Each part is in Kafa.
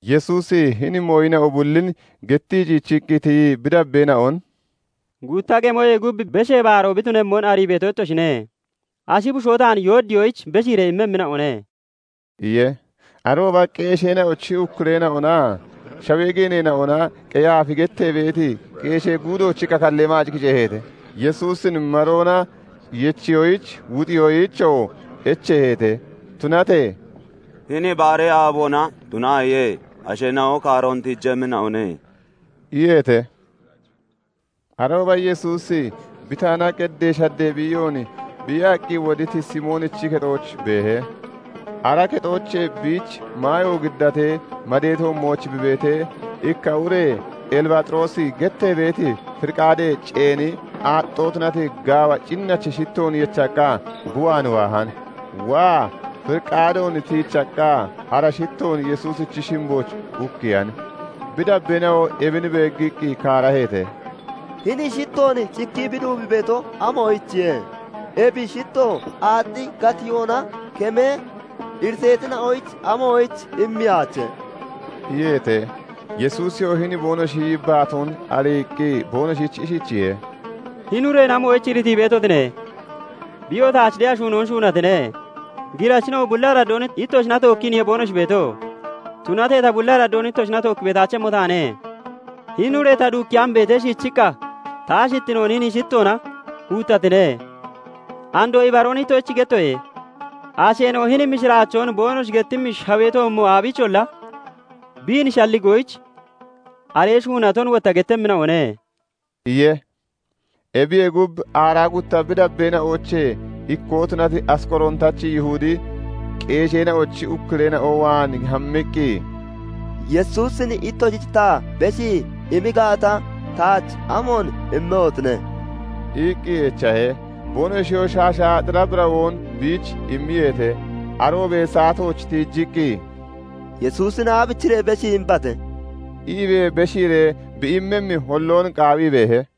Yesuusi hini mooyina'o bullin gettii ciichiqqi tiyii, bi dabbeena'on "Gutta qemoyee gub Beshee Baaroo bi tunemmon arii beeto ittoshine; ashi bushoo taan yoodiyoyich beshiiree immemmina'one" iye. Arooba qeesheena'ochi ukkureena'onaa shawee geeneena'ona Qeyaafi gettee beeti qeeshee guudoochi kakallee maac kiceeheete; Yesuusin maroona yechiyoyich, wuxiyoyichoo echeeheete. Tunatee "Hini baaree aaboona tunaaye; asheena'o kaaroon tiijemmina'one" iyeete. Arooba Yesuusi Bitaana, qeddee shaddee biiyoon biiyaqqi woditi Simoonichi kexooch beehe. Ara kexoochee biich maayo giddatee madee toommooch bi beetee, ikka ure elibaaxiroosi gettee beeti firiqaadee ceeni, aaxxoo tunati, gaawa cinnachi shittoon yechaqqa bi waan waahan. Waa firiqaadoon tiichaqqa ara shittoon Yesuusichi shimbooch ukkiyan. Bi dabbeena'o ebin beeggiqqi kaaraheete; "Hini shitttoon cikkii bi duubii beeto amoyichiye? Ebi shittto aaxxi gatiyoona kemee iriteetina'oyich amoyich immeyaache?" iyeete. Yesuusiyoo hini boonoshi yibbaatoon ariiqqi boonoshich ishichiye:- "Hini ureen amoyich iritii beetotine? Biyoo taach de'a shuunoon shuunatine. Girachina'o bulli araddoon ittoshina tookkiiniye boonoshi beeto; tunatee ta bulli araddoon ittoshina tookki beetaachemmo taane. Hini ure ta duukkeyaan beetee, shiichiqqa ta ashittinoon hini shitttoona huuttatine. Andoo ibaroon ittoshich gettoye; asheena'o hini mishiraachoon boonoshi getimmi shawee toommo aabiicholla biin shalligoyich aree shuunaton wotta gettemmina'one" iye. Ebiyee gub, aaraa gutta bi dabbeena'oochee ikkoo tunati Asqorootachi Yihudi, qeesheena'ochi ukkureena'o waan hammiqqi, "Yesuusin ittoshich ta beshii immi gaata, taach amoon immehotine?" iqqi echahe. Boonoshiyoo shaasha xira birawoon biich immiyeete. Aroobee saatoochee tiijiqqi "Yesuusin aabichiree beshii imbate?" iibee beshiiree bi immemmi holloon qaawii beehe.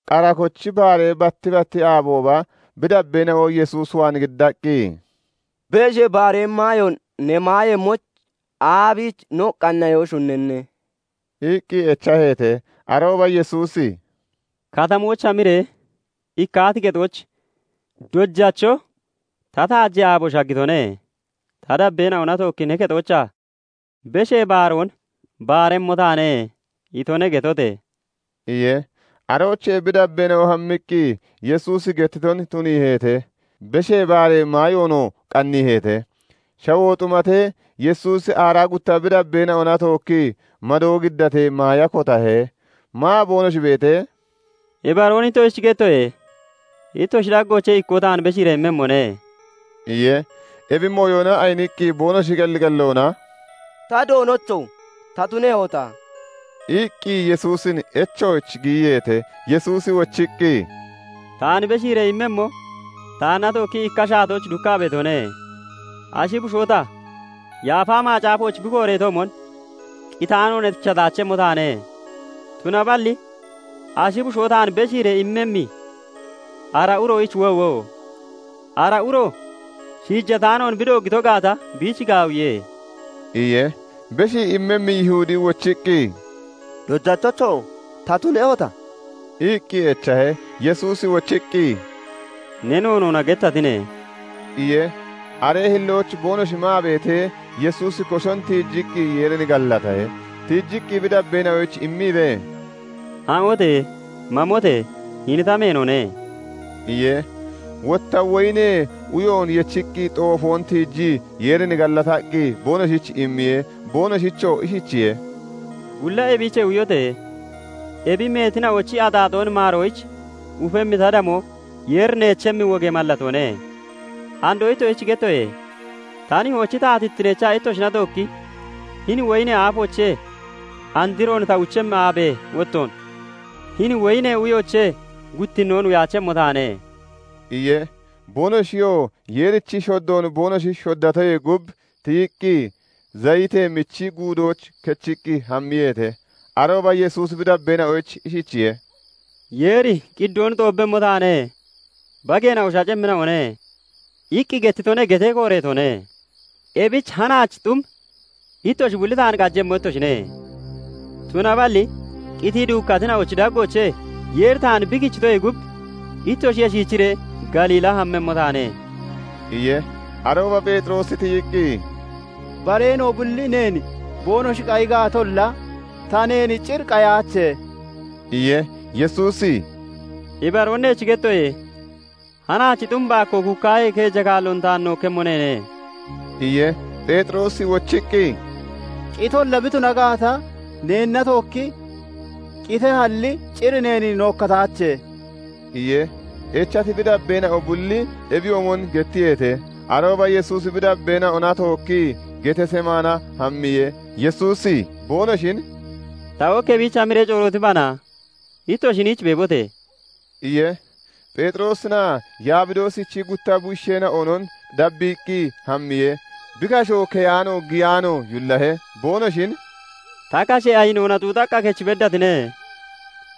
Qara kochi baaree batti batti aabooba bi dabbeena'o Yesuus waan giddaqqi, "Beshee Baaree maayoon ne maayemmoyich aabiich no qanniyoon shunnanne?" iqqi echaheete. Arooba Yesuusi "Katamooch hamiree ikkaati kexooch 'Dojacho "Ta taajee aabo shaggitone; ta dabbeena'ona tookki ne kexoochaa Beshee Baaroon baaremmo taane" itone' getote!" iye. Aroochee bi dabbeena'o hammiqqi Yesuusi gettiton tuniiheete; Beshee Baaree maayoonoo qanniiheete. Shawoo xumatee, Yesuusi aaraa gutta bi dabbeena'ona tookkii madoo giddatee maaya kotahe. Maa boonoshi beetee, "Ibaroon ittoshich gettoye; ittoshi daggoochee ikkoo taan beshiiree immemmone" iye. Ebi mooyona ayiniqqi boonoshi qelli qelloona "Ta Doonocho! Ta tunehota?" iqqi Yesuusin echooch giyiyeete. Yesuusi wochiqqi, "Taan beshiiree immemmo taanna tookkii ikka shaatooch dukkaa beetone. Ashi bushoo ta, Yaafa Macaafooch bi kooreetoomon, qitaanoon echataachemmo taane; tunaballi ashi bushoo taan beshiiree immemmi ara uroyich woowo! Ara uro shiijataanoon bi dooggito gaata, biich gaawiye" iye. Beshii immemmi Yihudi wochiqqi, "Dojachocho! Ta tunehota?" iqqi echahe. Yesuusi wochiqqi, "Ne noonoona gettatine" iye. Aree hillooch boonoshi maa beetee, Yesuusi koshon tiijiqqi Yeerin gallatahe; tiichiqqi bi dabbeena'oyich imiibee, "Ha'ote, mamote! Hini ta meenone" iye. Wotta woyinee uyo yechiti xoofoon tiijii Yeerin gallataqqi boonoshich immiye; boonoshichoo ishichiye:- "Bulla ebiichee uyote! Ebi meetina'ochi axaaxoon maaroyich ufemmi ta damoo Yeeri neechemmi wogee mallatoone. Andoo ittoshich gettoye; ta nihoochi taatittineecha ittoshina tookki hini woyinee aafoochee androon ta uchemmi aabee wottoon hini woyinee uyoochee guttinnoon uyaachemmo taane" iye. Boonoshiyoo Yeerichi shoddoon boonoshi shoddatoyee gub tiyiqqi, Zayitee Michi Guudooch kechiqqi hammiyeete. Arooba Yesuusi bi dabbeena'oyich ishichiye:- " 'Yeeri "Qiddoon xoobbemmo taane; bageena'o shacemmina'one" iqqi gettitone' gettee kooreetone; ebichi hanaach xum ittoshi bulli taan qajemmo ittoshine. Tunaballi qitii duukkatina'ochi daggoochee Yeeri taan bi kichitoyee gub, ittoshiyee shiichiree Galiilla hammemmo taane" iye. Arooba Pheexiroosi tiyiqqi, "Bareena'o bulli neen boonoshi qayi gaatolla, ta neen cir qayaache" iye. Yesuusi "Ibaroon neech gettoye; hanaach xum baakkoo kuukkaahee, keeja kaalloon taan nookkemmo neene" iye. Pheexiroosi wochiqqi, "Qitolla bi tuna gaata, neenna tookki qitehalli cir neen nookkataache" iye. Echati bi dabbeena'o bulli ebiyoomon gettiyeete. Arooba Yesuusi bi dabbeena'ona tookkii Getesemaana hammiye. Yesuusi boonoshin "Ta ok ebiich hamiree corootibana; ittoshi hiniich beebote!" iye. Pheexiroosinaa Yabidoosichi gutta bushiisheena'onon dabbiiqqi hammiye. Bi kasho keyaano giyaano yullahe. Boonoshin "Ta kashe ayinoona xuuxaqqa kech beddatine.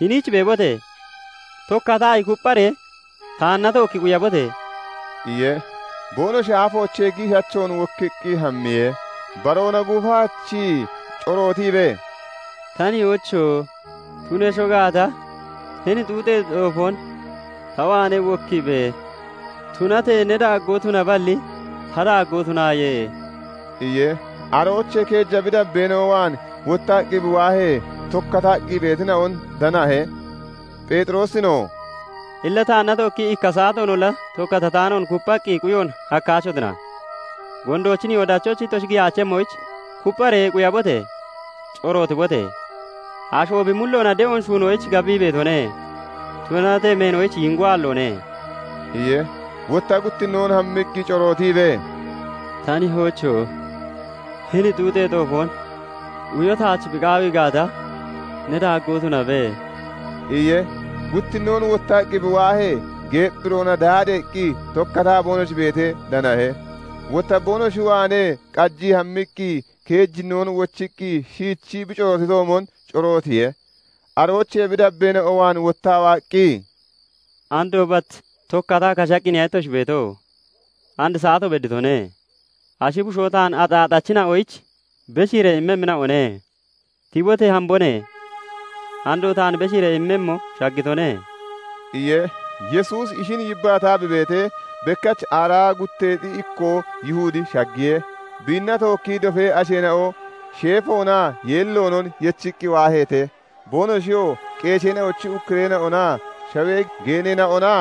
Hiniich beebote! Tokkataayi kuppharee taanna tookki quyabote!" iye. Boonoshi aafoochee giishachoon wokkiqqi hammiye. Baroona gufaachii corootiibee, "Ta nihoocho! Tunesho gaata, hini xuuxee xoofoon (Xuyoon) ta waanee wokkiibe! Tunatee ne daaggoo tunaballi, ta daaggoo tunaaye" iye. Aroochee keeja bi dabbeena'o waan wottaqqi bi waahee, tokkataqqi beetina'on danahe. Pheexiroosinoo "Illa taanna tookkii ikka saatoonolla tokkatataanoon kupphaqqi quyoon hakkaachotina? Gondoochi nihoo dachooch ittoshi giyaachemmoyich, kuppharee quyabote! Corootibote! Asho bi mulloona de'oon shuunoyich gabii beetone; tunatee meenoyich yiingoo aalloone" iye. Wotta guttinnoon hammiqqi corootiibee, "Ta nihoocho! Hini xuuxee xoofoon (Xuyoon) uyo taach bi qaawii gaata, ne daaggoo tunabe" iye. Guttinnoon wottaqqi bi waahee, geepphiroona daadeeqqi tokkataa boonoshi beetee danahe. Wotta boonoshi waanee qajii hammiqqi, keejinnoon wochiqqi shiichii bi corootitoomon corootiye. Aroochee bi dabbeena'o waan wottaa waaqqi, "Andoo bat tokkataa kashaqqiniya ittoshi beeto? And saato bedditone; ashi bushoo taan axaaxachina'oyich beshiiree immemmina'one. Tibote! Hambone. Andoo taan beshiiree immemmo shaggitone" iye. Yesuusi ishin yibbaataa bi beetee, bekkach aaraa gutteexi ikkoo Yihudi shaggiye. Biinna tookkii dofee asheena'o sheefoonaa yeelloonon yechiqqi waaheete. Boonoshiyoo qeesheena'ochi ukkureena'onaa shawee geeneena'ona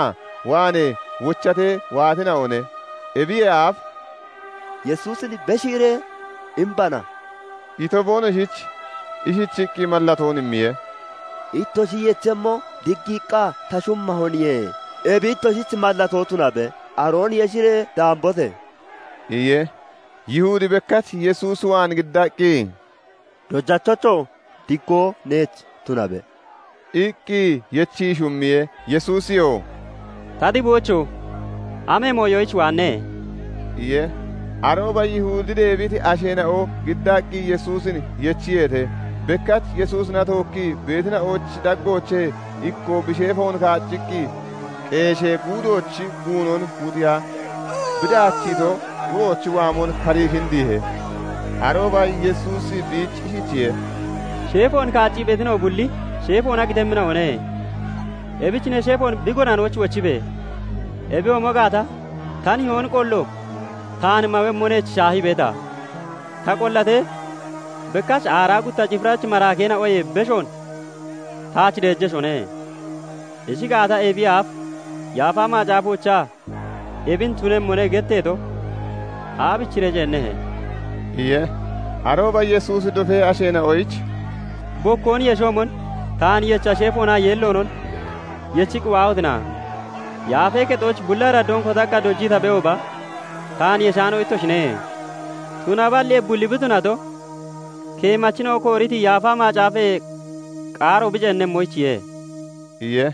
waanee wochatee waatina'one. Ebiyee aaf "Yesuusin beshiiree imbana" ito, boonoshich ishichiqqi mallatoon immiye; "Ittoshi yechemmo, diggiiqqa ta shummahoniye; ebi ittoshich mallatoo tunabe. Aroon yeshiree daambote!" iye. Yihudi bekkach Yesuusi waan giddaqqi, "Dojachocho! Diggoo neech tunabe" iqqi yechii shummiye. Yesuusiyoo "Ta xiboocho! Amee mooyoyich waanne?" iye. Arooba Yihudi deebiti asheena'o giddaqqi Yesuusin yechiyeete. Bekkach Yesuusina tookkii beetina'ochi daggoochee ikkoo bi sheefoon kaacciqqi qeeshee guudoochi guunon wuxiya bi daachiito uroochi waamoon karii kindiihe. Arooba Yesuusi biich ishichiye:- "Sheefoon kaaccii beetina'o bulli sheefoona qitemmina'one; ebich ne sheefoon bi gonanooch wochibe! Ebiyoomo gaata, ta nihoon qollo taan mawemmo neech shaahii beeta? Ta qollatee, bekkach aaraa gutta cifirachi maraakeena'oyee beshoon taach deejeshone. Ishi gaata, ebiyee aaf Yaafa Macaafoochaa 'Ebin tunemmone' getteeto aabichiree ceennehe?" iye. Arooba Yesuusi dofee asheena'oyich "Bokkoon yeshoomon taan yecha sheefoonaa yeelloonon yechiqqi waahotina? Yaafee Kexooch bulli araddoon kotaqqa dojii ta beehooba, taan yeshaano ittoshine. Tunaballi ebi bulli bi tunato, keemachina'o kooriti Yaafa Macaafee qaaro bi ceenemmoyichiye" iye.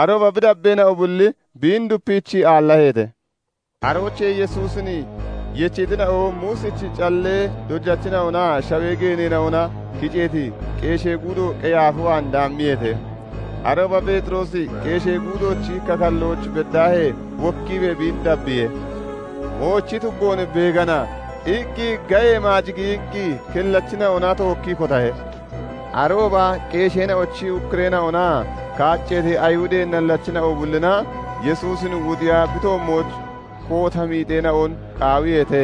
Arooba bi dabbeena'o bulli biin dupiichii aallaheete. Aroochee Yesuusin yechitina'o Muusichi callee dojachina'onaa shawee geeneena'ona kiceeti qeeshee guudo Qeyaaf waan daammiyeete. Arooba Pheexiroosi qeeshee guudoochi kakallooch beddaahee wokkiibee biin dabbiye. "Moochi tuggoon beegana" iqqi gayee maac giyiqqi kellachina'ona tookkii kotahe. Arooba qeesheena'ochi ukkureena'onaa kaacceeti Ayihudee nallachina'o bullina Yesuusin wuxiiya bi toommooch koota miixeena'on qaawiyeete;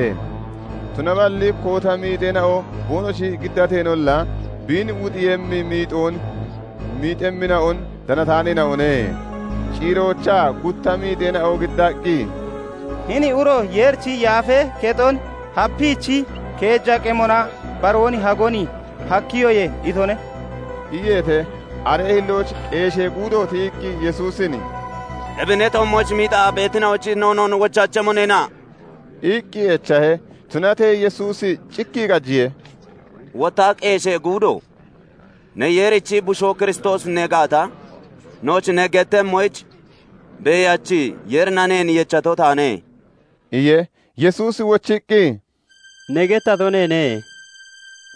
Tunaballi koota miixeena'o boonoshi giddateenolla, biin wuxiiyemmi miixoon miixemmina'on danataaneena'one. Ciiroochaa gutta miixeena'o giddaqqi, "Hini uro 'Yeerichi Yaafee kexon hapiichi keeja qemona baroon hagon hakkiyoye' itone" iyeete. Aree hillooch qeeshee guudo tiyiqqi Yesuusin "Ebi ne toommooch miixaa beetina'oyich noonoo wochaachemmo neena?" iqqi echahe. Tunatee Yesuusi cikkii qajiye. Wotta qeeshee guudo "Ne Yeerichi Bushoo Kiristoosi ne gaata, nooch ne gettemmoyich Beeyachi Yeerina neen yechato taane" iye. Yesuusi wochiqqi, "Ne gettato neene;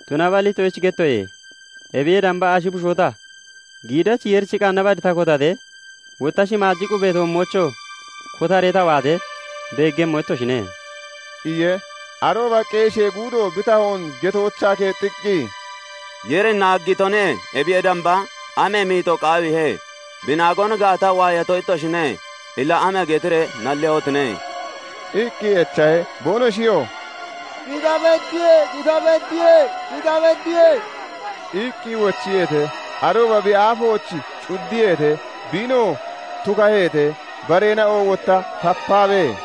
tunaballi ittoshich gettoye; ebiyee damba ashi bushoo ta, giidachi Yeerichi qanna bad ta kotatee, wotta shimaaji qubee toommoochoo kotaree ta waatee beeggemmo ittoshine" iye. Arooba qeeshee guudo bi tahoon getoochaa keexxiqqi, "Yeerin naaggitone; ebiyee damba amee miixoo qaawiihe? Bi naagoon gaata, waayato ittoshine. Illa ama getiree nallehotine?" iqqi echahe. Boonoshiyoo "Qita beddiye" iqqi wochiyeete. Arooba bi aafooch cuddiyeete; biinoo tukaheete; bareena'o wotta tapaabee,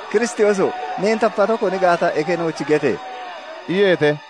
"Kiristooso! Neen tapato koni gaata, eke nooch gete!" iyeete.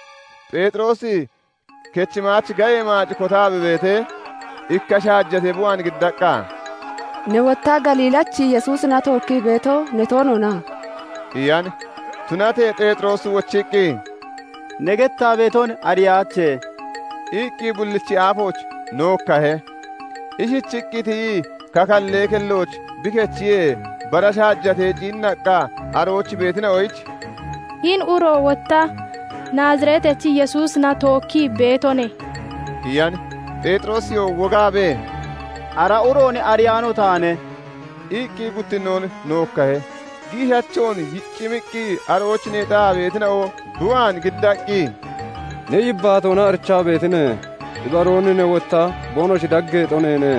Pheexiroosi kechi maach gayee maac kotaa bi beetee, ikka shaajatee bi waan giddaqqa, "Ne wotta Galiillachi Yesuusina tookkii beeto ne toona?" iyan. Tunatee Pheexiroosi wochiqqi, "Ne gettaa beeton ariyaache" iqqi bullichi aafooch nookkahe. Ishichiqqi tiyii kakallee kelloch bi kechiyee, bara shaajatee ciinnaqqa arooch beetina'oyich "Hini uro wotta Naazireetachi Yesuusina tookkii beetone" iyan. Pheexiroosiyoo wogaabee, "Ara uroon ariyaano taane" iqqi guttinnoon nookkahe. Giishachoon yiccimiqqi arooch neexaa beetina'o bi waan giddaqqi, "Ne yibbaatoona arichaa beetine; ibaroon ne wotta boonoshi daggeexo neene"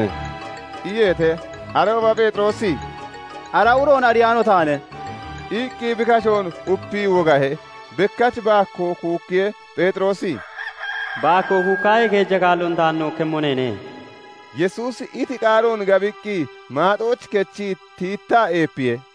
iyeete. Arooba Pheexiroosi "Ara uroon ariyaano taane" iqqi bi kashoon upii wogahe. Bekkach baakkoo kuukkiye. Pheexiroosi "Baakkoo kuukkaahee, keeja kaalloon taan nookkemmo neene" Yesuusi iti qaaroon gabiqqi maaxooch kechii tiittaa eepiye.